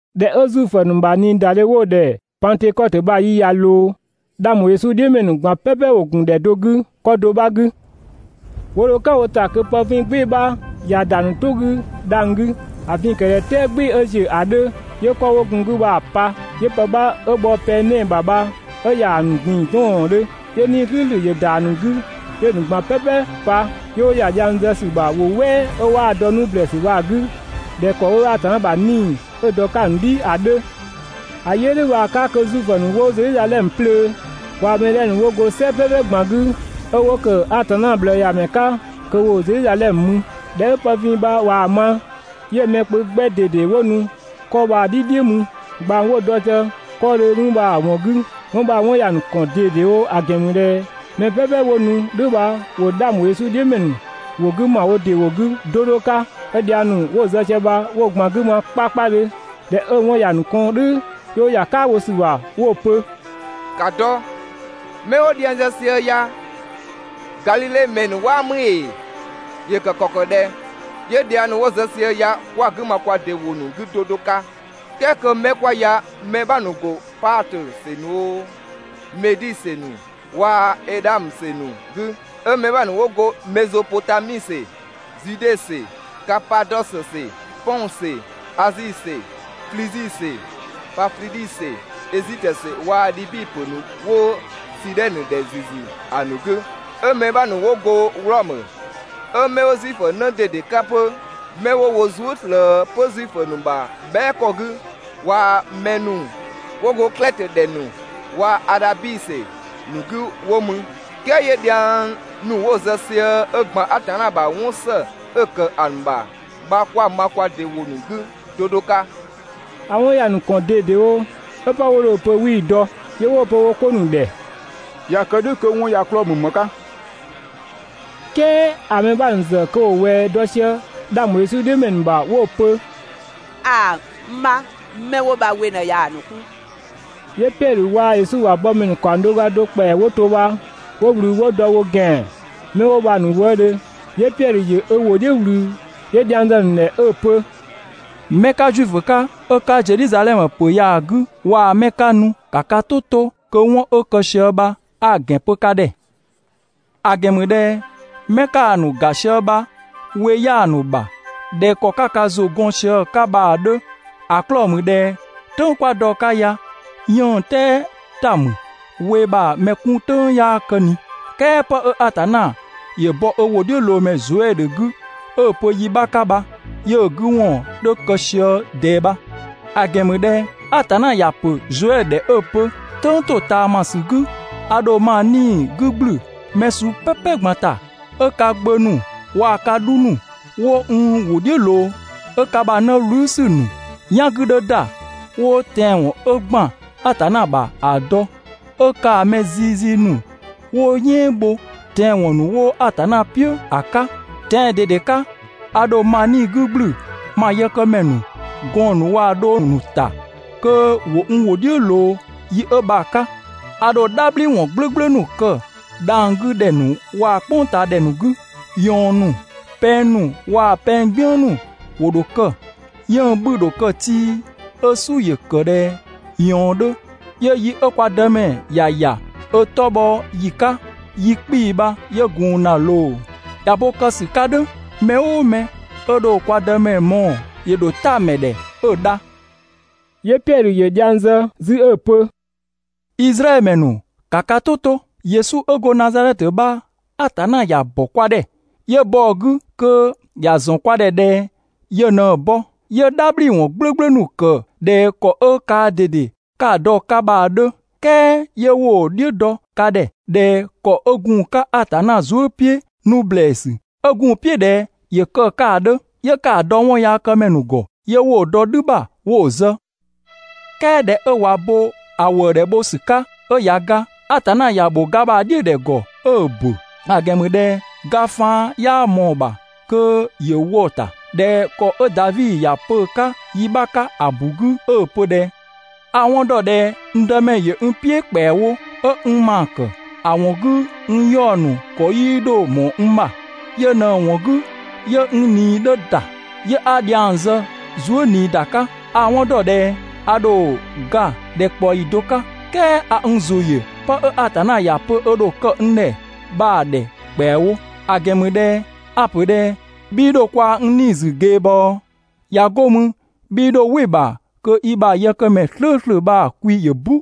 ꞊Dhɛ 'ö Zuifö ‑nu ‑bha ꞊niidadhe 'wo‑ ‑dhɛ Pangtökɔtö bha‑ yi ꞊ya ꞊loo, 'dhang ‑bho Yesu "dhiʋ̈ ‑mɛ ‑nu ꞊gban "pɛpɛ ‑wo ‑gun ‑dhɛ do 'gü 'kɔ do 'bha 'gü. 'Wo dho "kan wo ‑ta kö pë vin "gbɩɩ‑ 'bha ꞊ya ‑da ‑nu "tʋ 'gü dhang‑ 'gü. ‑A vin‑ ‑kë ꞊dhɛ "tɛɛ "gbɩɩ‑ 'ö ‑ziö ‑a 'dhö 'yö 'kɔ 'wo gun‑ 'gü bha‑ pa. 'Yö pë 'bha 'ö bhɔ pɛng 'nɛɛ‑ ‑bha bha 'ö ‑ya ‑a ‑nu ꞊gbin‑ 'dɔɔndhö. 'Yö 'Nii‑ "slʋ̈ʋ̈slʋ̈ ‑yö ‑da ‑a ‑nu 'gü, 'yö‑ ‑nu ꞊gban "pɛpɛ pa, 'yö 'wo ‑ya dhiang zë ‑sü ‑bha ‑wʋ "wɛɛ 'ö 'waa‑ dɔ 'nu ‑blɛɛsü bha‑ 'gü ꞊dhɛ ‑kɔ 'ö Atanna ‑bha 'Nii‑ bha 'ö‑ dɔ‑ 'ka‑ ‑nu "dhi ‑a 'dhö. ‑A yi 'ö "dhʋ̈ bha‑ 'ka kö Zuifö ‑nu 'wo Zedhizadhɛmö 'plöö, waa‑ mɛ 'dhɛ ‑nu 'wo go "sɛ "pɛpɛ ꞊gban 'gü, 'ö 'wo ‑kë Atanna ꞊bhlëëyamɛ 'ka kö ‑wo Zedhizadhɛmö mü. ꞊Dhɛ 'ö pë vin bha ꞊waa‑ ma, 'yö‑ mɛ kpö 'gbɛ ꞊dede 'wo nu 'kɔ bha‑ "dhi "dhiʋ̈ mü ꞊gbang 'wo‑ dɔ sië 'kɔɔdhö mü bha‑ ‑wɔn 'gü. 'Wɔn bha‑ 'wɔn ‑ya ‑nu ‑kɔn ꞊dedewo, ‑a ‑gɛn ‑mü ꞊dhɛ mɛ "pɛpɛ 'wo nu "dhʋ̈ bha ‑wo 'dhang ‑bho Yesu "dhiʋ̈ ‑mɛ ‑nu ‑wʋ 'gü ma wo ‑dɩ ‑wʋ ‑nu 'gü 'do 'do 'ka, 'ö dhiang ‑nu 'wo‑ zë sië bha 'wo‑ 'gü ma 'kpakpadhö. ꞊Dhɛ 'ö‑ 'wɔn ‑ya ‑nu kɔn "dhʋ̈, 'yö 'wo ‑ya "kaabho bho ‑sü ‑bha 'wo‑ pö: «‑Ka dɔ! 'Mɛ 'wo dhiang zë sië ya, Gadhidhe ‑mɛ ‑nu 'waa ‑mü ‑ee? ‑Yö kë ‑kɔ ‑kë ꞊dhɛ 'yö dhiang ‑nu 'wo‑ zë sië ya kwa‑ 'gü ma kwa ‑dɩ ‑wʋ ‑nu 'gü 'do 'do 'ka? "Kɛɛ kö 'mɛ 'kwa ya mɛ 'bha ‑nu ‑go Paatö ‑sɛ ‑nu oo, Medi ‑sɛ ‑nu waa‑ Edhamö ‑sɛ ‑nu 'gü, 'ö mɛ 'bha ‑nu ‑wo go Mezopotami ‑sɛ, Zude ‑sɛ, Kapadɔsö ‑sɛ, Pɔng ‑sɛ, Azi ‑sɛ Flizi ‑sɛ, Panfidhi ‑sɛ, Ezitö ‑sɛ waa‑ Dhibi ‑pö ‑nu 'wo Sidhɛnö ‑dhɛ ‑züzü ‑a ‑nu 'gü, 'ö mɛ 'bha ‑nu 'wo go Wlɔmö, 'ö mɛ 'wo Zuifö 'në ꞊dede 'ka 'pö, 'mɛ 'wo wo zuë" ꞊slëë 'pö Zuifö ‑nu ‑bha bhɛa" ‑kɔ 'gü waa‑ mɛ ‑nu 'wo go Klɛtö ‑dhɛ ‑nu, waa‑ Adhabi ‑sɛ ‑nu 'gü 'wo mü, "kɛɛ 'yö dhiang ‑nu 'wo‑ zë sië 'ö ‑gban Atanna ‑bha 'wɔn ‑së 'ö‑ ‑kë ‑a ‑bha bha 'kwa‑ ma kwa ‑dɩ ‑wʋ ‑nu 'gü 'do 'do 'ka?» ‑A 'wɔn ‑ya ‑nu ‑kɔn ꞊dedewo 'ö 'pë 'wo dho‑ pö 'wii‑ dɔ, 'yö 'wo‑ pö wo 'ko ‑nu ‑dhɛ: «꞊Ya kë "dhʋ̈ kö 'wɔn ya‑ 'klɔɔ‑ ‑mü ‑më 'ka?» "Kɛɛ ‑a mɛ bha ‑nu ‑zë kö ‑wo ꞊wɛɛ dɔ sië 'dhang bho Yesu "dhiʋ̈ ‑mɛ ‑nu ‑bha 'wo‑ pö: «‑Aa, n 'bha, 'mɛ 'wo bha we ꞊në ꞊yaa‑ ‑nu 'kun!» 'Yö Piɛdhö waa‑ Yesu ‑bha bɔmɛ ‑nu ‑kaɔng do ga do ‑kpɛa 'wo to bha 'wo ꞊wlü 'wo dɔ wo ‑gɛan 'mɛ 'wo bha‑ ‑nu wëëdhö, 'yö Piɛdhö ‑yö ö ‑wʋ "dhiʋ̈ ꞊wlü 'yö dhiang zë‑ ‑nu ‑dhɛ 'ö‑ pö: «'Mɛ 'ka Zuifö 'ka, 'ö 'ka Zedhizadhɛmö ‑pö ya‑ 'gü waa 'mɛ 'ka nu, ‑ka ka "tʋ 'to kö 'wɔn 'ö kë sië bha 'a‑ ‑gɛn pö ka ‑dhɛ. ‑A ‑gɛn ‑mü ꞊dhɛ 'mɛ 'ka‑ ‑nu ‑ga sië bha we 'yaa‑ ‑nu ‑bha ꞊dhɛ ‑kɔ 'ka ka ‑zʋ 'gɔn sië‑ 'ka bha‑ 'dhö. ‑A 'klɔɔ‑ ‑mü ꞊dhɛ "tʋ̈ng 'kwa dɔ‑ 'ka ya "yënng "tɛɛ ‑ta ‑mü (we ‑bha mɛ 'kun "tʋ̈ng 'yaa kë ꞊ni!). "Kɛɛ 'pë 'ö Atanna ‑yö bɔ ö ‑wʋdhiʋ̈loomɛ Zoɛdhö 'gü 'ö‑ pö yi 'bha 'ka bha 'yö‑ 'gü ‑wɔn 'dhö kë sië ꞊dɛɛ bha. ‑A ‑gɛn ‑mü ꞊dhɛ Atanna ‑ya ‑pö Zoɛdhö ‑dhɛ 'ö‑ pö: ‹"Tʋ̈ng ‑totaamasü 'gü, a ‑dho ma 'Nii‑ 'gü ‑gblü mɛ suu "pɛpɛ ꞊gban ‑ta, 'ö ka gbö ‑nu waa‑ ka 'dhu ‑nu 'wo n ‑wʋ "dhiʋ̈ ꞊loo, 'ö ka ‑bha 'në "wlü ‑sü ‑nu "yan 'gü 'dhö ‑da 'wo tɛanwɔn 'ö ‑gban Atanna ‑bha ‑a dɔ 'Ö kaa‑ mɛ zizi ‑nu 'wo "yɛɛn bho (tɛanwɔn ‑nu 'wo Atanna "piʋ̈) ‑a 'ka. Tɛan‑ ꞊dede 'ka, a ‑dho ma 'Nii‑ 'gü ‑gblü ma yëkëmɛ ‑nu, gɔɔn‑ ‑nu waa‑ dhong ‑nu ‑ta kö ‑wo n ‑wʋ "dhiʋ̈ ꞊loo yi 'ö bha‑ 'ka. A ‑dho "dhabhliwɔn "gblʋ̈gblʋ̈ ‑nu kë dhang‑ 'gü ‑dhɛ ‑nu waa‑ "kpʋngtaadhɛ ‑nu 'gü. ꞊Yɔɔn ‑nu, pɛng ‑nu waa‑ pɛng "gbiën ‑nu ‑wo ‑dho kë. 'Yënng‑ 'bhü‑ ‑dho kë tii, 'ö "su ‑yö ‑kë ꞊dhɛ ꞊yɔɔn 'dhö, 'yö yi 'ö kwa Dëmɛ ‑ya ‑ya ö 'tɔ bhɔ ‑yi 'ka, yi 'kpii‑ bha 'yö gun ‑na ꞊loo. ꞊Ya bo kë ‑sü 'ka "dhʋ̈, mɛ "ʋʋ mɛ 'ö dho kwa Dëmɛ mɔɔ‑, ‑yö ‑dho "ta‑ ‑mɛ ‑dhɛ 'ö‑ dha›.» 'Yö Piɛdhö ‑yö dhiang zë 'zü 'ö‑ pö: «Izraɛdhö ‑mɛ ‑nu, ‑ka ka "tʋ to: Yesu 'ö go Nazadhɛtö bha Atanna ‑ya ‑bɔ kwa ‑dhɛ, 'yö bɔ‑ 'gü kö ‑ya ‑zɔn kwa ‑dhɛ ꞊dhɛ yö ꞊në‑ bɔ, 'yö "dhabhliwɔn "gblʋ̈gblʋ̈ ‑nu ‑kë ꞊dhɛ ‑kɔ 'ö kaa ꞊dede 'ka‑ dɔ‑ 'ka bha‑ 'dhö. "Kɛɛ 'yö 'wo‑ "dhiʋ̈ dɔ ka ‑dhɛ ꞊dhɛ ‑kɔ 'ö gun‑ 'ka Atanna zuë" "piʋ̈ 'nu ‑blɛɛsü, 'ö gun‑ "piʋ̈ ꞊dhɛ ‑yö kë‑ 'ka ‑a 'dhö, 'yö 'ka‑ dɔ 'wɔnyaakëmɛ ‑nu ‑gɔ, 'yö 'wo‑ dɔ "dhü ‑bha 'wo‑ zë, "kɛɛ ꞊dhɛ 'ö ꞊wa bo‑ ‑wëëdhɛ bho ‑sü 'ka 'ö ꞊ya ga, Atanna ‑ya ‑bho ga ‑bha "dhiʋ̈dhɛ ‑gɔ 'ö‑ bo, ‑a ‑gɛn ‑mü ꞊dhɛ ga faan 'yaa ꞊mɔɔ‑ ‑bha kö ‑yö wɔ‑ ‑ta ꞊dhɛ ‑kɔ 'ö Davi ‑ya pö‑ 'ka yi 'bha 'ka ‑a ‑bu 'gü 'ö‑ pö ꞊dhɛ: ‹A‑ 'wɔn dɔ ꞊dhɛ n Dëmɛ ‑yö n "piʋ̈ ‑kpɛawo, 'ö n ‑maa ‑kë, ‑a ‑wɔn 'gü n 'yaɔ‑ ‑nu ‑kɔ 'yii 'dho ꞊mɔɔ n ‑bha. Yö ꞊në‑ ‑wɔn 'gü 'yö n ꞊nii 'dhö ‑da, 'yö 'a dhiang zë zuë" ꞊nii ‑da 'ka. A‑ 'wɔn ‑dɔ ꞊dhɛ a ‑dho ga ‑dhɛkpaɔyi do 'ka, "kɛɛ a n ‑zʋ ‑yö 'pë 'ö Atanna ‑ya pö ö ‑dho kë n ‑dhɛ bha‑ ‑dhɛ ‑kpɛawo. ‑A ‑gɛn ‑mü ꞊dhɛ a‑ ‑pö ‑dhɛ: 'Bhii 'dho kwaa‑ n 'nii‑ ‑zü ꞊geebɔɔ, ꞊ya 'go mü 'bhii 'dho "wɩ‑ ‑bha kö i ‑bha yëkëmɛ "slʋ̈ʋ̈slʋ̈ bha‑ kwi ‑yö "bu.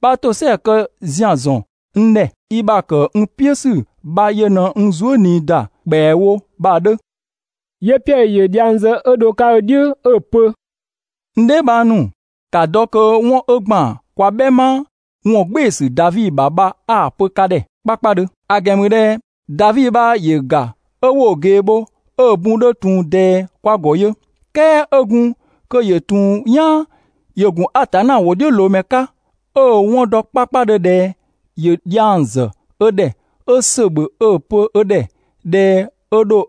'Bha ‑tosɛa kë ‑zian ‑zɔn n ‑dhɛ, i ‑bha ‑kë n "piʋ̈ ‑sü bha ‑yö n zuë" ꞊nii ‑da ‑kpɛawo› bha‑ 'dhö.» 'Yö Piɛdhö ‑yö dhiang zë 'ö dho‑ 'ka ö "dhiʋ̈ 'ö‑ pö: «N dheebhang ‑nu, ‑ka dɔ kö 'wɔn 'ö ‑gban kwa "bhɛma ‑wɔngbɩɩsü Davi ‑bha bha 'a‑ pö ka ‑dhɛ 'kpakpadhö. ‑A ‑gɛn ‑mü ꞊dhɛ Davi bha ‑yö ‑ga 'ö 'wo‑ ꞊gee bho, 'ö‑ bun 'dhö ‑tun ꞊dɛɛ kwa ‑gɔ yö. "Kɛɛ 'ö gun kö ‑yö ‑tun "yaan ‑yö ‑gun Atanna ‑wʋdhiʋ̈loomɛ 'ka, 'ö‑ 'wɔn dɔ 'kpakpadhö ꞊dhɛ ‑yö dhiang ‑zë ö ‑dhɛ 'ö ‑sö ‑bhö 'ö‑ pö ö ‑dhɛ ꞊dhɛ ö ‑dho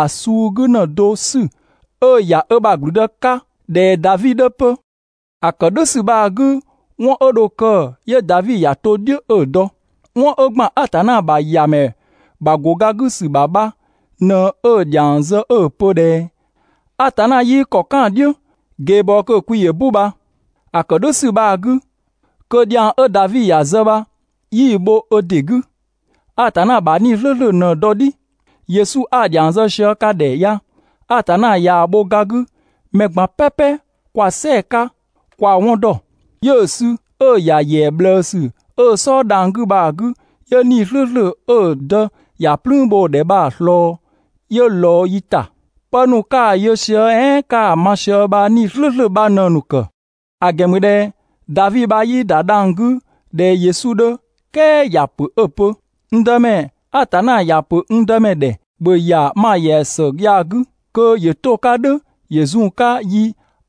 ‑a suu 'gü ‑në do 'sü 'ö‑ ‑ya ö ‑bha ‑gblüdë 'ka ꞊dhɛ Davi 'dhö 'pö. ‑A ‑kë "dhʋ̈ ‑sü bha‑ 'gü 'wɔn 'ö dho kë 'yö Davi ‑ya to "dhiʋ̈ 'ö‑ dɔ. 'Wɔn 'ö ‑gban Atanna ‑bha ‑Yamɛ ‑bha ‑go ga 'gü ‑sü ‑bha bha ꞊në 'ö‑ ‑dhiang zë 'ö‑ pö ꞊dhɛ: ‹Atanna 'yii ‑kɔ "kan‑ "dhiʋ̈ ꞊geebɔɔ kö‑ kwi ‑yö "bu› bha. (‑A ‑kë "dhʋ̈ ‑sü bha‑ 'gü, kö dhiang 'ö Davi ‑ya zë bha 'yii‑ bho ö ‑dɩ 'gü, Atanna ‑bha 'Nii‑ "slʋ̈ʋ̈slʋ̈ ꞊në‑ dɔ‑ "dhi.) Yesu 'a‑ ‑dhiang zë sië ka ‑dhɛ ya, Atanna ꞊yaa‑ bho ga 'gü, mɛ ꞊gban "pɛpɛ kwa‑ "sɛɛ‑ 'ka, kwa‑ 'wɔn ‑dɔ. 'Yö‑ sü 'ö‑ ‑ya ‑yɛa ꞊bhlëësü 'ö‑ "sɔɔ dhang‑ 'gü bha‑ 'gü, 'yö 'Nii‑ "slʋ̈ʋ̈slʋ̈ 'ö‑ dë ‑ya "plüün bho‑ ‑dhɛ bha‑ ꞊slɔɔ, 'yö‑ ꞊lɔɔ yi ‑ta. Pë ‑nu 'ka‑ yö sië "ɛɛn 'ka‑ ma sië bha 'Nii‑ "slʋ̈ʋ̈slʋ̈ bha ꞊në‑ ‑nu ‑kë. ‑A ‑gɛn ‑mü ꞊dhɛ Davi bha 'yii ‑da dhang‑ 'gü ꞊dhɛ Yesu 'dhö, "kɛɛ ‑ya ‑pö 'ö‑ pö: ‹N Dëmɛ Atanna ‑ya ‑pö n Dëmɛ ‑dhɛ: ‑Bhö ‑ya ma ‑yɛa ‑së ya‑ 'gü! Kö ‑yö 'to‑ 'ka "dhʋ̈ ‑yö zun‑ 'ka yi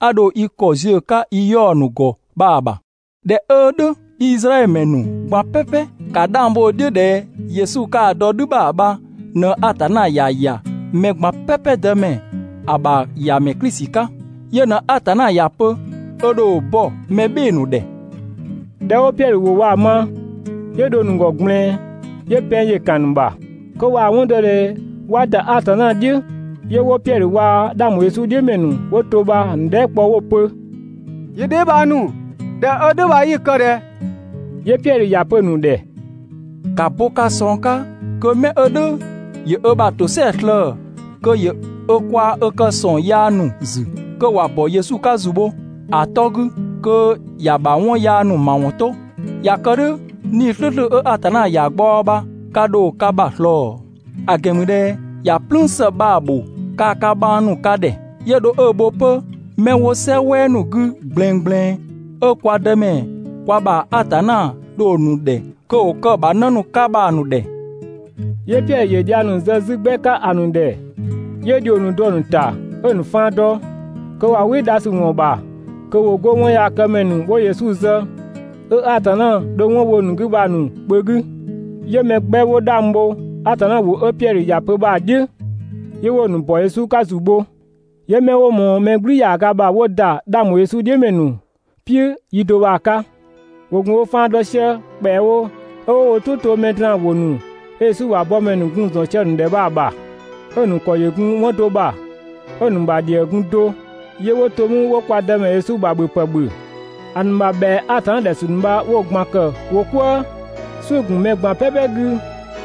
'a dho i ‑kɔ ziö‑ 'ka i 'yaɔ‑ ‑nu ‑gɔ bha‑ ‑bha›. ꞊Dhɛ 'ö "dhʋ̈ Izraɛdhö ‑mɛ ‑nu ꞊gban "pɛpɛ, ‑ka 'dhang bho‑ "dhiʋ̈ ꞊dhɛ Yesu 'ka‑ dɔ "dhü ‑bha bha ꞊në Atanna ‑ya ‑ya mɛ ꞊gban "pɛpɛ Dëmɛ, ‑a ‑bha ‑Yamɛ Klisi 'ka. Yö ꞊në Atanna ‑ya pö ö ‑dho bɔ mɛ "bhɩɩ‑ ‑nu ‑dhɛ.» ꞊Dhɛ 'wo Piɛdhö ‑wʋ bha‑ ma, 'yö dho‑ ‑nu ‑gɔ ꞊gblɛɛn, 'yö pɛng ‑yö ‑kan ‑nu ‑bha, kö ꞊waa‑ 'wɔn dɔ ꞊dhɛ 'wa ‑da Atanna "dhiʋ̈. 'Yö 'wo Piɛdhö waa‑ 'dhang ‑bho Yesu "dhiʋ̈ ‑mɛ ‑nu 'wo to bha‑ ‑nu dhɛɛ" kpɔ 'wo‑ pö: «Yi dheebhang ‑nu, ꞊dhɛ 'ö "dhʋ̈ bha 'yi‑ kë ꞊dhɛ?» 'Yö Piɛdhö ‑ya pö‑ ‑nu ‑dhɛ: «‑Ka bo ka ꞊sɔng 'ka kö 'mɛ 'ö "dhʋ̈ ‑yö ö ‑bha ‑tosɛadhe slëë‑, kö ‑yö ö kwaa‑ ö kë ‑sɔng yaa ‑nu ‑zü, kö ‑wa ‑bɔ Yesu 'ka ‑zu bho Yes ‑a 'tɔ 'gü, kö ‑ya ‑bha 'wɔn yaa ‑nu ‑mawɔn 'to! ꞊Ya kë "dhʋ̈ 'Nii‑ "slʋ̈ʋ̈slʋ̈ 'ö Atanna ‑ya ꞊gbaɔ bha ka ‑dho ka ‑bha ꞊slɔɔ. ‑A ‑gɛn ‑mü ꞊dhɛ ‑ya "plüün ‑së bha‑ ‑bho kaa‑ ka bhang ‑nu ka ‑dhɛ, 'yö dho 'ö‑ bho 'pö 'mɛ 'wo "sɛ "wɛɛ ‑nu 'gü ꞊gblɛɛngblɛɛn, 'ö kwa Dëmɛ, kwa ‑bha Atanna dho‑ ‑nu ‑dhɛ kö ‑wo kë‑ ‑bha 'në ‑nu 'ka bha‑ ‑nu ‑dhɛ.» 'Yö Piɛdhö ‑yö dhiang ‑nu zë 'zü 'gbɛ 'ka ‑a ‑nu ‑dhɛ, 'yö ‑dhio ‑nu dɔ‑ ‑nu ‑ta 'ö‑ ‑nu faan dɔ, kö ꞊wa "wɩ dha ‑sü ‑wɔn ‑bha kö ‑wo 'go 'wɔnyaakëmɛ ‑nu 'wo Yesu zë, 'ö Atanna dho 'wɔn bho‑ ‑nu 'gü bha‑ ‑nu kpö 'gü. 'Yö mɛ 'gbɛ 'wo 'dhang bho Atanna ‑wʋ 'ö Piɛdhö ‑ya pö bha‑ "dhiʋ̈, 'yö 'wo‑ ‑nu ‑bɔ Yesu 'ka ‑zu bho. 'Yö mɛ 'wo ꞊mɔɔ mɛ "gblü ‑yaaga ‑bha 'wo ‑da 'dhang ‑bho Yesu "dhiʋ̈ ‑mɛ ‑nu "piʋ̈ yi do bha‑ 'ka. ‑Wo ‑gun wo faan dɔ sië ‑kpɛawo 'ö 'wo wo "tʋ to mɛ draan‑ ‑wʋ ‑nu 'ö Yesu ‑bha bɔmɛ ‑nu gun‑ ‑zɔn sië‑ ‑nu ‑dhɛ bha‑ ‑bha. 'Ö‑ ‑nu ‑kɔ ‑yö ‑kë 'wɔn do ‑bha, 'ö‑ ‑nu ‑bha ‑dhië gun do, ('yö 'wo to mü 'wo kwa Dëmɛ Yesu ‑bha ‑bhöpë ‑bhö), ‑a ‑nu ‑bha ‑bhɛa Atanna ‑dhɛ ‑sü ‑nu bha 'wo‑ ꞊gban ‑kë wo "kwëë. "Suʋ̈‑ ‑gun mɛ ꞊gban "pɛpɛ 'gü,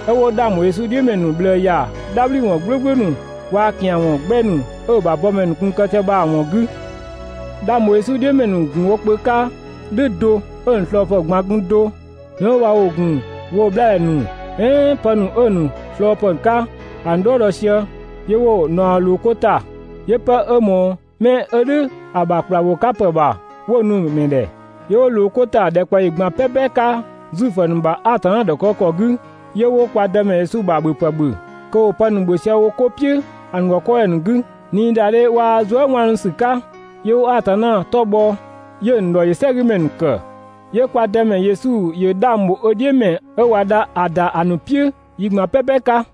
'ö 'wo 'dhang ‑bho Yesu "dhiʋ̈ ‑mɛ ‑nu ꞊bhlëë ‑ya "dhabhliwɔn "gblʋ̈gblʋ̈ ‑nu waa‑ ‑kian ‑wɔn 'gbɛ ‑nu 'ö‑ ‑bha bɔmɛ ‑nu gun‑ kë sië bha‑ ‑wɔn 'gü. 'Dhang ‑bho Yesu "dhiʋ̈ ‑mɛ ‑nu ‑gun wo kpö 'ka "dhʋ̈ do, 'ö‑ ‑nu ꞊slɔɔpë ꞊gban‑ gun do. 'Mɛ 'wo bha ‑wo gun woo‑ 'bhlaadhɛ ‑nu, "ɛɛn pë ‑nu 'ö‑ ‑nu ꞊slɔɔpë 'ka ‑a ‑nu "dhɔɔ dɔ sië 'yö 'wo‑ ‑naɔ ꞊loo 'ko ‑ta, 'yö 'pë 'ö ꞊mɔɔ 'mɛ 'ö "dhʋ̈ ‑a ‑bha ‑kpla ‑bho 'ka ‑pë ‑bha 'wo‑ nu‑ ‑mɛ ‑dhɛ. 'Yö 'wo ꞊loo 'ko ‑ta ‑dhɛkpaɔyi ꞊gban "pɛpɛ 'ka Zuifö ‑nu ‑bha Atanna ‑dhɔkëgükɔ 'gü, 'yö 'wo kwa Dëmɛ Yesu ‑bha ‑bhöpë ‑bhö, kö ‑wo pë ‑nu ‑bhö sië 'ko "piʋ̈ ‑a ‑nu ‑gɔ 'kɔɔdhɛ ‑nu 'gü ꞊niidadhe waa‑ zuëwaanusü 'ka. 'Yö 'wo Atanna 'tɔ bhɔ, 'yö‑ ‑nu ‑dhɔ ‑yö "sɛgümɛ ‑nu ‑kë. 'Yö kwa Dëmɛ Yesu ‑yö 'dhang bho ö "dhiʋ̈ ‑mɛ 'ö ꞊wa dha ‑a ‑da ‑a ‑nu "piʋ̈ yi ꞊gban "pɛpɛ 'ka.